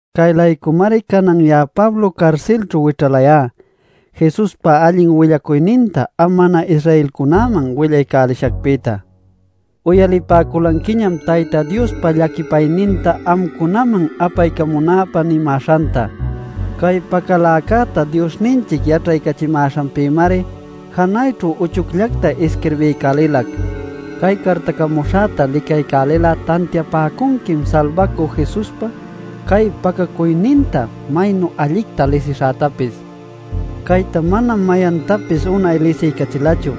Cay-laycumari canan ya'a Pablo carsilćhu wićhalayá Jesuspa allin willacuyninta am mana-Israelcunäman willaycälishacpïta. Uyalipäculanquiñam Tayta Diospa llaquipayninta amcunaman apaycamunäpä nimäśhanta. Cay pacaläcäta Diosninchic yaćhaycachimäśhanpïmari janayćhu uchucllacta isquirbiycälilac. Cay cartacamuśhäta licaycälil'a tantiapäcunquim Salbacü Jesuspa cay pacacuyninta maynu allicta lisishätapis. Cayta manam mayantapis unay lisiycachilachu.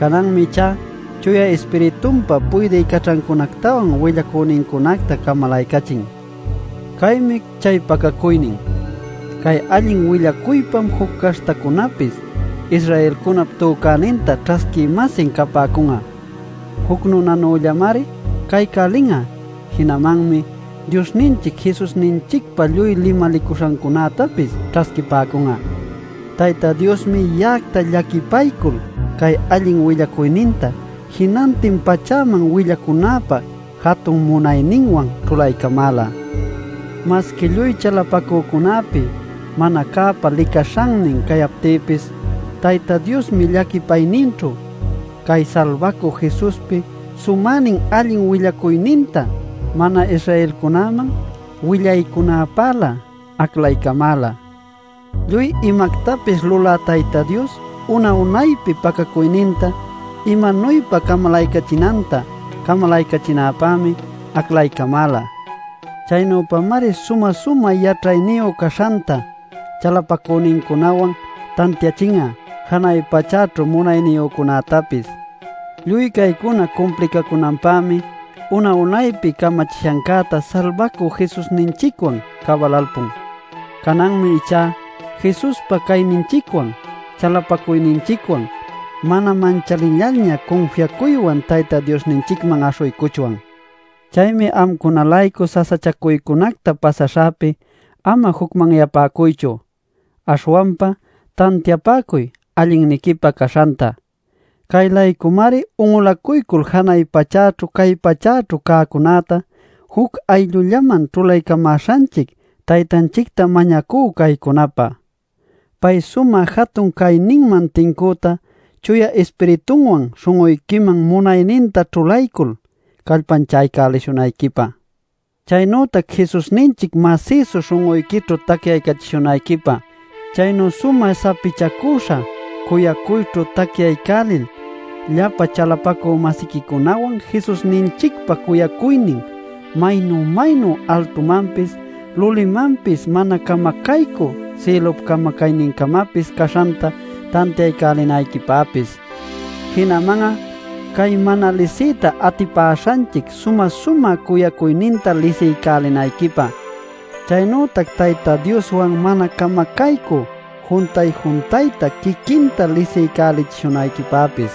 Cananmi ichá Chuya Ispiritunpa puydï caćhancunactawan willacünincunacta camalaycachin. Caymi chay pacacuynin: Cay allin willacuypam juc caśhtacunäpis Israelcunap tücäninta ćhasquï-masin capäcun'a; juc nunanüllamari caycälin'a; jinamanmi Diosninchic Jesusninchicpa lluy limalicuśhancunätapis ćhasquipäcun'a. Tayta Diosmi ya'acta llaquipaycul cay allin willacuyninta jinantin pachäman willaycunäpä jatun munayninwan ćhulaycamäla. Masqui lluy chalapacücunäpi mana cäpa licaśhannin cayaptïpis Tayta Diosmi llaquipayninćhu cay Salbacü Jesuspi sumänin allin willacuyninta mana-Israelcunäman willaycunäpälä aclaycamäla. Lluy imactapis lulä Tayta Dios una-unaypi pacacuyninta imanuypa camalaycachinanta camalaycachinäpämi aclaycamäla. Chaynüpamari sumä-sumä yaćhayniyu caśhanta chalapacünincunawan tantiachin'a janay pachäćhu munayniyücunätapis. Lluy caycuna cumplicacunanpämi una unaypi camachishancäta Salbacü Jesusninchicwan cabalalpun. Cananmi ichá Jesuspa cayninchicwan chalapacuyninchicwan mana manchalillalña cunfiacuywan Tayta Diosninchicman aśhuycuchwan. Chaymi amcuna-laycu sasachacuycunacta pasaśhäpi ama jucmanyapäcuychu, aśhwanpa tantiapäcuy allinniquipä caśhanta. Cay-laycumari un'ulacuycul janay pachäćhu cay pachäćhu cäcunäta juc ayllullaman ćhulaycämäśhanchic Taytanchicta mañacú caycunapä: Pay sumä jatun cayninman tincüta Chuya Ispiritunwan śhun'uyquiman munayninta ćhulaycul, callpanchaycälishunayquipä; chaynütac Jesusninchic masïsu śhun'uyquićhu tacyaycachishunayquipä; chaynu sumä sapichacüśha cuyacuyćhu tacyaycälil llapa chalapacü-masiquicunawan Jesusninchicpa cuyacuynin maynu-maynu altumanpis, lulimanpis mana camacaycü sïlup camacaynincamapis caśhanta tantiaycälinayquipäpis. Jinaman'a cay mana lisiyta atipäśhanchic sumä-sumä cuyacuyninta lisiycälinayquipä; chaynütac Tayta Dioswan mana camacaycü juntay-juntayta quiquinta lisiycälichishunayquipäpis.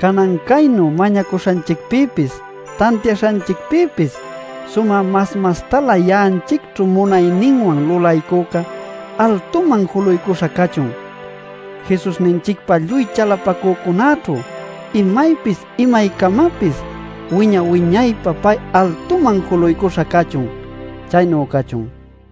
¡Canan caynu mañacuśhanchicpïpis tantiaśhanchicpïpis sumä mas mastalä ya'anchicćhu munayninwan lulaycüca altuman juluycuśha cachun! ¡Jesusninchicpa lluy chalapacücunäćhu imaypis imaycamapis wiña-wiñaypä pay altuman juluycuśha cachun! Chaynu cachun.